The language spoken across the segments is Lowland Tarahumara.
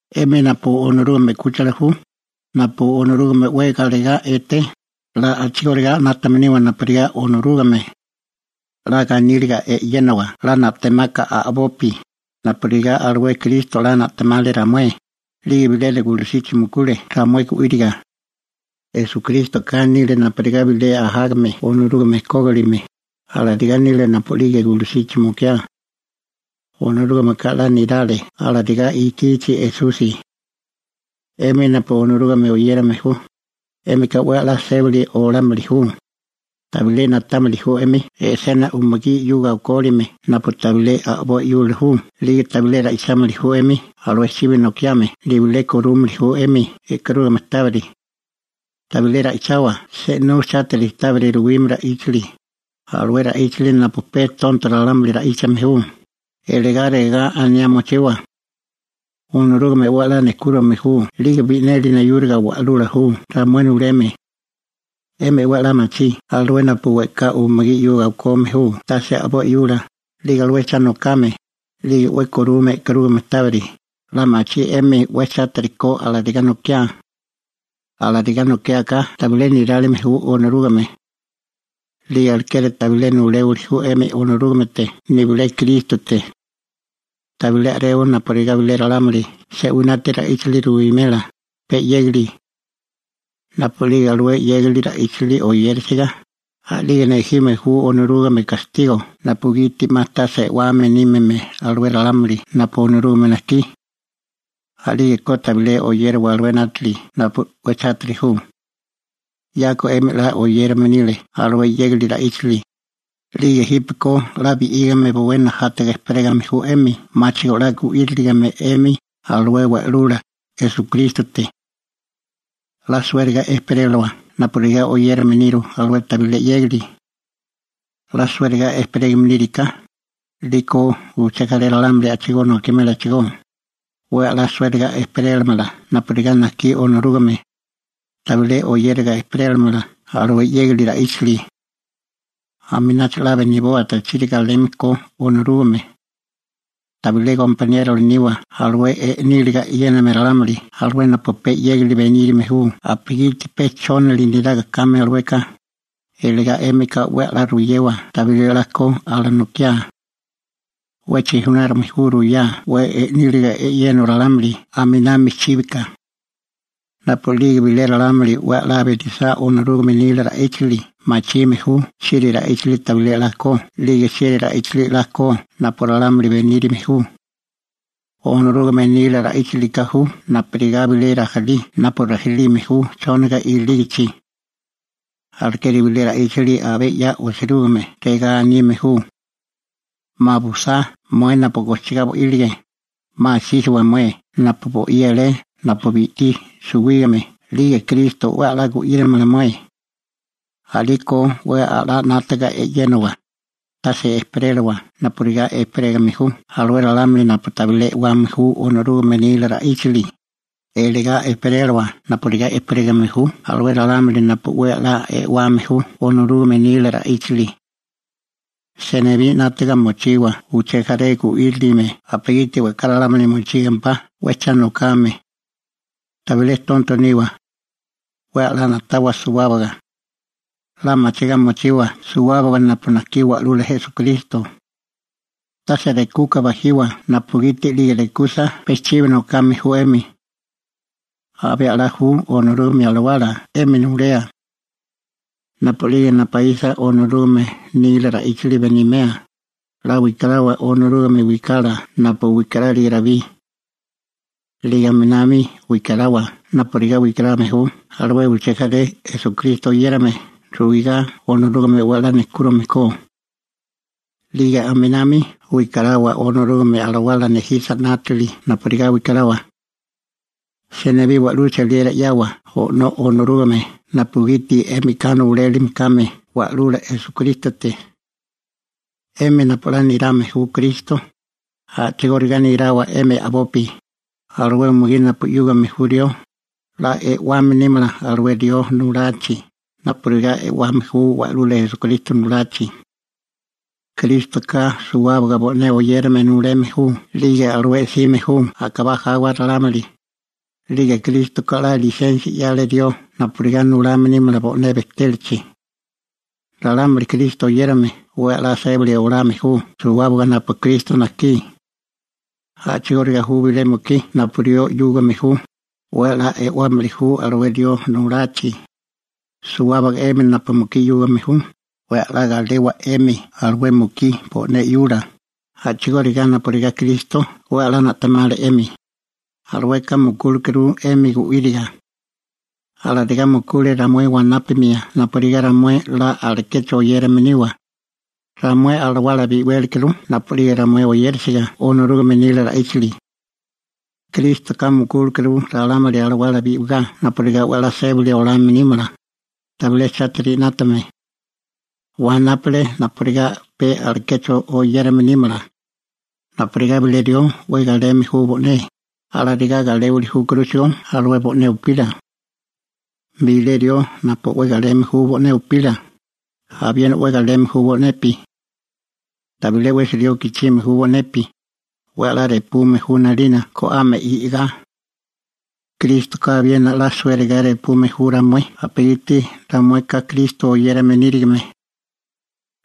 'Emi napu Onorúgame 'kúchila ju, napu Onorúgame 'we galegá eté, 'la a'chigóriga 'nátame niwa napurigá Onorúgame. 'La ganíliga e'yénawa 'la na'temaka a'bopi, napurigá alué Kristo 'la na'temale ramué, 'lige bilena gulusichi mukule ramué gu'íriga. Esukrístoka nile napurigá bilé ajágame Onorúgame kógilime, alarigá nile napu'lige gulusichi mukiá. Onorúgameka 'la nirale alarigá ikichi Esusi. 'Emi napu Onorúgame oyérame ju, 'émika 'we a'lá sébili olámili ju. Tabilé na'támili ju 'emi e'sena umugí 'yuga okólime napu tabilé a'boi 'yula ju 'lige tabilé ra'ichámili ju 'emi alué chibi nokiame nibilé korúmili ju 'emi e'karúgamea tábiri. Tabilé ra'ichawa se'nú chátiri tábiri ruwime ra'íchali, alué ra'íchali napu pe alué tonto ralámuli ra'íchame ju, iligá regá aniá mochiwa: «Onorúgame 'we 'la nejkúrame ju 'lige bi'neli neyúriga Wa'lula ju ramué nuleme.» 'Émi 'we a'lá machí alué napu we'ká umugí 'yuga okome ju tase a'boi 'yula, 'lige alué cha nokame, 'lige 'we korume e'karúgame tábiri, 'la machí 'emi 'we chátiri ko alarigá nokiá. Alarigá nokiáká tabilé nirálime ju Onorúgame. 'Lige alekeri tabilé nuléwili ju 'emi Onorúgamete nibilé Krístote. Tabilé a'rewa napurigá bilé ralámuli se'winátiri ra'íchali ruwimela, pe 'yégali. Napu'lige alué 'yégali ra'íchali oyérisiga, a'lige nejime ju Onorúgame gastigo napugiti 'ma tase e'wame nímime alué ralámuli napu Onorúgame najkí. A'lígeko tabilé oyérawa alué 'nátili napu 'we chátiri ju. 'Yako 'emi 'la oyérame nile alué 'yégali ra'íchali, 'lige jípeko 'la bi'lígame bowé najátaga ejperégame ju 'emi, 'máchigo 'la gu'íriligime 'emi alué Wa'lula Esukrístote. 'La suériga ejperélawa, napurigá oyérame niru alué tabilé 'yégali. 'La suériga ejperégame níriká, 'liko uché jaré ralámuli a'chigó nokimélachigó, 'we 'la suériga ejperélamala napurigá najkí Onorúgame, tabilé oyériga ejperélamala alué 'yégali ra'íchali. Aminacho 'la beniboa tachiri galeme ko Onorúgame. Tabilé gompaniérola niwa alué i'níliga e'yéname ralámuli alué napu pe 'yégali benírime ju napugiti pe chónali neraga kame alueka, iligá 'émika 'we 'la ruyewa tabilé 'la ko alanokiá. 'We chijunárume ju ruwá 'we i'níliga e'yéneo ralámuli a'minami chíbika. Napu'lige bilé ralámuli 'we 'la benisá Onorúgame nila ra'íchali machime ju chieri ra'íchali tabilé 'la ko 'lige chieri ra'íchali 'la ko napu ralámuli benírame ju. Onorúgame nila ra'íchalika ju napurigá bilé rajilí napu rajilime ju chóniga ilígichi. Alekeri bilé ra'íchali abé 'ya osirúgime, regá anime ju: 'Ma busá, mué napu gojchigá bo'ílige, 'ma asísiwa mué napu bo'í alé napu bi'tí suwígame 'lige Kristo 'we 'la gu'írimala mué. A'liko 'we 'la 'nátaga e'yénawa, tase ejperéliwa napurigá ejperégame ju alué ralámuli napu tabilé e'wame ju Onorúgame nila ra'íchali, iligá ejperéliwa napurigá ejperégame ju alué ralámuli napu 'we a'lá e'wame ju Onorúgame nila ra'íchali. Senibí 'nátaga mochiwa uché jaré gu'írilime napugiti we'ká ralámuli mochígimempá 'we cha nokame. Tabilé tonto niwa. 'We 'la na'tawa suwábaga. 'La machigá mochiwa suwábaga napu najkí Wa'lula Esukristo. Tase rekuka bajiwa napugiti 'lige rekusa pe chibi nokame ju 'emi. Abé a'lá ju Onorúgame Alawala 'emi nulea. Napu'lige napaísa Onorúgame nila ra'íchali benimea, 'la wikarawa Onorúgame wikala napu wikarálige Rabí. 'Lige aminami wikarawa napurigá wikarame ju alué uché jaré Esukristo oyérame ruigá Onorúgame 'we 'la nejkúrime ko. 'Lige aminami wikarawa Onorúgame Alawala nejisa 'nátili napurigá wikarawa. Senibí wa'lú cheliera 'yawa O'nó Onorúgame napugiti 'émika nulélime kame Wa'lula Esukrístote. 'Emi napu 'la nirame ju Kristo, a'chigóriga nirawa 'emi a'bopi. Alué umugí napu 'yúgame ju rió, 'la e'wame nímala alué rió nulachi, napurigá e'wame ju Wa'lula Esukristo nulachi. Krístoka suwábaga bo'né oyérame nuleme ju 'lige alué 'sime ju a'kabá jawa ralámuli, 'lige Krístoka 'la lisensia 'yale rió napurigá nulame nímala bo'né bejtélachi. Ralámuli Kristo oyérame 'we 'la sébali olame ju suwábaga napu Kristo najkí. A'chigóriga ju bilé mukí napu rió 'yúgame ju, 'we 'la e'wámili ju alué rió nulachi. Suwábaga 'emi napu mukí 'yúgame ju, 'we 'la galewa 'emi alué mukí bo'né 'yula, a'chigóriga napurigá Kristo 'we 'la na'temale 'emi. Alueka mukúlekuru 'emi gu'íriga. Alarigá mukule ramué wanápamia napurigá ramué 'la alekecho oyérame niwa. Ramué alawala bi'wélikuru napu'lige ramué oyérisiga Onorúgame nila ra'íchali. Krístoka mukúlekuru ralámuli alawala bi'wigá napurigá 'we 'la sébali olame nímala, tabilé chátiri 'nátame. Wanápale napurigá pe alekecho oyérame nímala. Napurigá bilé rió 'we galeme ju bo'né, alarigá galémili júkuruchigó alué bo'né upila. Bilé rió napu 'we galeme ju bo'né upila, abiena 'we galeme ju bo'nepi. Tabilé 'wesi rió gichime ju bo'nepi, 'we 'la repume ju 'nalina go'ame i'gá. Krístoka abiena 'la suériga repume ju ramué napugiti ramueka Kristo oyérame nírigime.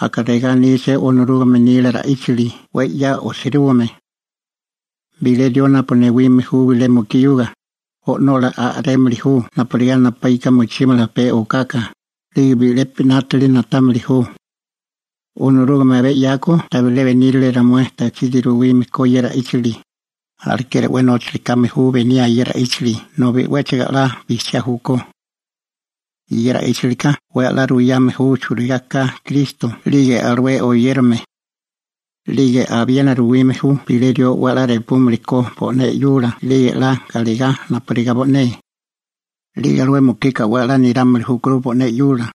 Aka regá aníché Onorúgame nila ra'íchali 'we 'ya osirúgime: «Bilé rió napu newime ju bilé mukí 'yuga, o'nola a'rémili ju napurigá napaíka mochímala pe okaka, 'lige bi'lepi 'nátili na'támili ju.» Onorúgame abé 'yako tabilé benírale ramué tachiri ruwime ko ye ra'íchali, alekeri 'we nóchali kame ju beniaa ye ra'íchali nobi 'wéchigo 'we 'la bijchiá júkó. Ye ra'íchalika 'we 'la ruyame ju churigá ka Kristo 'lige alué oyérame. 'Lige abiena ruwime ju bilé rió 'we 'la repúmili ko bo'né 'yula 'lige 'la galegá napurigá bo'né. 'Lige alué mukika 'we 'la nirámili júkuru bo'né 'yula.